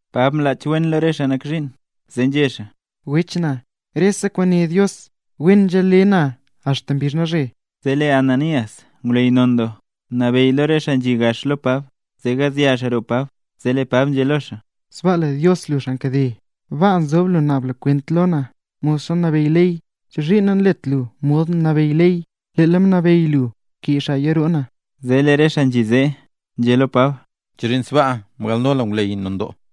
Pab mlach wen lo re xaa nak zhiin zee nzhé xaa: —Wech na, rese kwaan né Dios wen nzhale na axta mbizh nalzhe. Zee lee Ananías, ngwleyy non doo, mnabeyy re xaa nzhi gax lo Pab zee gazya xaa roo Pab. Zee lee Pab nzhé lo xaa: —¡Sbaaka le Dios lu, xaa nkade! Baa nzob lu naab lu kwent lo na modxa nabeyy ley. ¿Chozhiin nanlet lu mod nabeyy ley, leel mnabeyy lu kee xaaya roo na? Zee lee re xaa nzhi zee, nzhé xaa lo Pab: —¿Chozhiin sbaa mgalno lu ngwleyy non doo?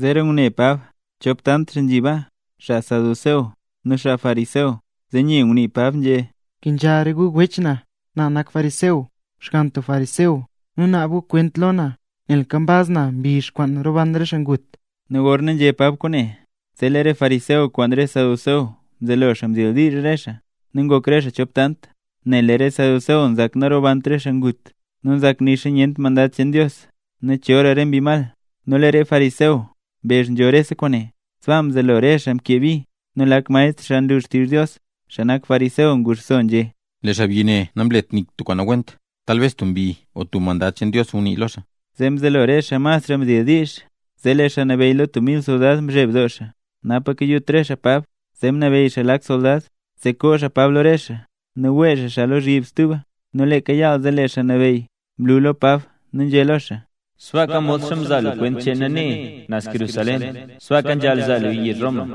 Zeera ngune Pab chop tant xaa nzhi baa, xaa saduceo nu xaa fariseo, zee nye ngunii Pab nzhé: —Nkenzha re gu wech na; na nak fariseo, xgann tub fariseo, nu naab gu kwent lo na nel nkambaz na mbizh kwaan roban re xaa ngut. Nu gorna Pab nzhé kwaane, zee lee re fariseo kwaan re saduceo mzelo xaa mdildiizh re xaa, nu ngok re xaa chop tant. Nel lee re saduceo nzak nanrobant re xaa ngut, nu nzak nixa nyent mandad cheen Dios, nu chora re mbi mal. Nu lee re fariseo mbezh nzho rese kwaane. Sbaa mzelo rese xaa mkee bi; nu lak maestr xaa nlu xtizh Dios, xaa nak fariseo, nguxso nzhé: —Lee xaabyi ne namlet nik tub kwaan nawent, talbes tub mbi o tub mandad cheen Dios ngunii lo xaa. Zee mzelo re xaa masra mdildiizh. Zee lee xaa nabeyy lo tub mil soldad mzheb doo xaa napaka kayut re xaa Pab. Zee mnabeyy xaa lak soldad zee koo xaa Pab lo re xaa nu wee xaa xaa lozhyib stuba. Nu leeka yaal zee, lee Xaa Nabeyy mlu lo Pab nu nzhé lo xaa: —Sbaaka modxa mzaa lu kwent cheen na nee, naz Jerusalén, sbaaka nzhaal zaa luya yezh Roma.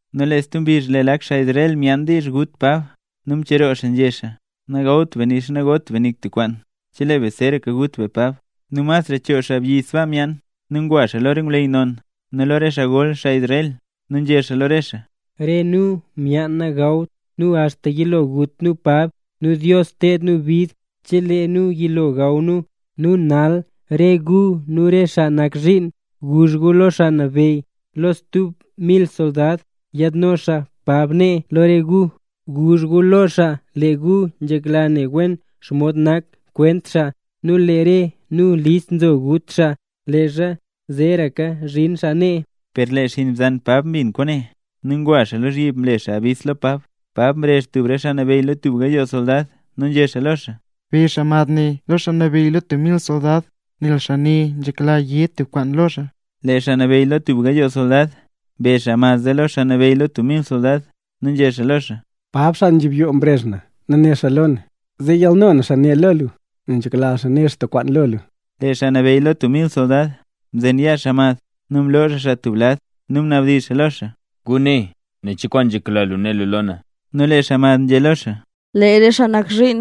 Nu lee stub mbizh lee lak xaa Israel myaan diizh gut Pab, nu mcheroo xaa nzhé xaa: “Nagawt be nixa nagot be nik tub kwaan chelee be zeeraka gut be Pab”. Nu masra choo xaabyi sbaa myaan. Nu ngwa xaa lo re ngwleyy non nu lo re xaa gol xaa Israel nu nzhé xaa lo re xaa: —Re nu myaan nagawt nu axta yilo gut nu Pab, nu Dios ted nu bid chelee nu yilo gaw nu. Nu nal re gu nu re xaa nak zhiin, guzh gu lo xaa nabeyy lo tub mil soldad, yaadno xaa Pab nee lo re gu. Guzh gu lo xaa lee gu nzhekla ne wen xomod nak xkwent xaa, nu lee re nu list zo gut xaa leezha zeeraka zhin xaa nee. Per lee xinn bzan Pab mbin kwaane, nu ngwa xaa lozhyib mle xaa yabis lo Pab. Pab mrezh tub re xaa nabeyy lo tub gayoo soldad, nu nzhé lo xaa: —Be xaa mad ne lo xaa nabeyy lo tub mil soldad, nel xaa ne nzhekla yé tub kwaan lo xaa. Lee xaa nabeyy lo tub gayoo soldad mbe xaa mad zee lo xaa nabeyy lo tub mil soldad, nu nzhé xaa lo xaa: —Pab, xaa nzhibyoo mrezh na, nu né xaa lo na zee yalno na xaa ne lo lu, nel nzhekla xaa né xaa tub kwaan lo lu. Lee xaa nabeyy lo tub mil soldad mzen yaa xaa mad, nu mloo xaa xaa tub lad nu mnabdizh xaa lo xaa: —Guné, nen cho kwaan nzhekla lu né lu lo na. Nu lee xaa mad nzhé lo xaa: —Lee re xaa nak zhiin,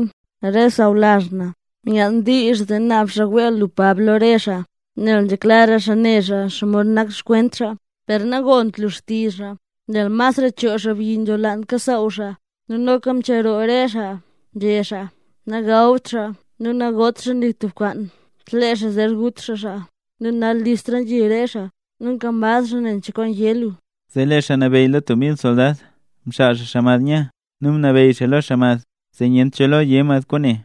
re sawlazh na, myaan diizh zee naab xaa wee lu Pab lo re xaa, nel nzhekla xaa nera xaa xomod nak xkwent xaa. Per nagont lu xtizh xaa, nel masra choo xaabyi nzholaanla kasaaw xaa, nu noka mcheroo re xaa nzhé xaa, nagawt xaa nu nagot xaa nik tub kwaan chelee xaa zer gut xaa xaa. Nu nal listla nzhi re xaa, nkambaz xaa nen cho kwaan yé lu. Zee lee xaa nabeyy lo tub mil soldad mxaal xaa xaa mad nya, nu mnabeyy xaa xaa mad zee nyent cho lo yé mad kwaane.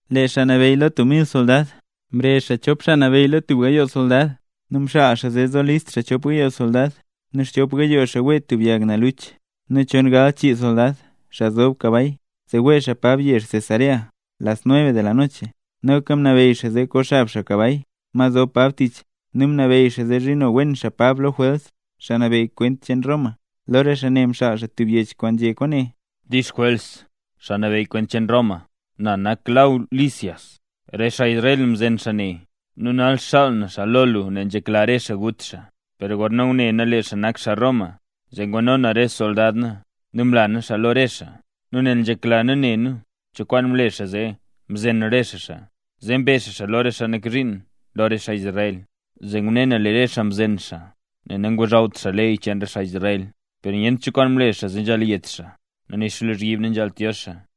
Lee xaa nabeyy lo tub mil soldad mrezh chop xaa nabeyy lo tub gayooga soldad, nu mxaal xaa zee zo list xaa chop gayoo soldad, nu xchop gayoo xaa wee tubga yag naluch, nu chon gal chii soldad, xaa zob kabay, zee wee xaa Pab yezh Cesarea las nueve mzhela yizhyo. Noka mnabeyy xaa zee koxab xaa kabay, ma zob Pab tich; nu mnabeyy xaa zee zhino wen xaa Pab lo Jwels, xaa nabeyy kwent cheen Roma. Lo re xaa ne mxaal xaa tub yech kwaan nzhé kwaane: “Dix Jwels, xaa nabeyy kwent cheen Roma. Na nak Law Lisias. Re xaa Israel mzen xaa ne, nu nal xaal na xaa lo lu nel nzhekla re xaa ngut xaa, per gorna ngune na lee xaa nak xaa Roma, zee ngwano na re soldad na nu mla na xaa lo re xaa. Nu nel nzhekla na ne na cho kwaan mle xaa zee mzen re xaa xaa; zee mbe na xaa lo re xaa nak zhiin lo re xaa Israel, zee ngune na lee re xaa mzen xaa nel nangozhawt xaa ley cheen re xaa Israel. Per nyent cho kwaan mle xaa zee nzhaal yet xaa, nu nixa lozhyib nanzhaalt yo xaa.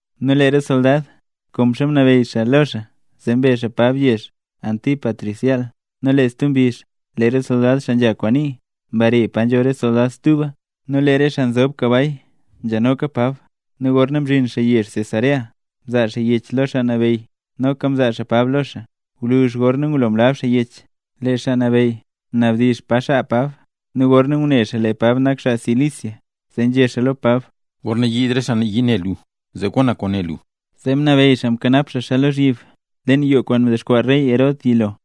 Nu lee re soldad, konxa mnabeyy xaa lo xaa, zee mbe xaa Pab yezh Antípatris yaal. Nu lee stub mbizh lee re soldad xaa nzha kwaan nii mbare pa nzho re soldad stuba, nu lee re xaa nzob kabay nzhanoka Pab. Nu gorna mzhin xaa yezh Cesarea, mzaa xaa yech lo xaa nabeyy, noka mzaa xaa Pab lo xaa. Gwluzh gorna ngulo mlab xaa yech, lee xaa nabeyy mnabdizh pa xaa Pab; nu gorna ngune xaa lee Pab nak xaa Cilicia, zee nzhé xaa lo Pab: —Gorna yiid re xaa nayii ne lu zee gon na kwaan né lu. Zee mnabeyy xaa mkanap xaa xaa lozhyib leen yoo kwaan mdexkwaa rey Herod yilo.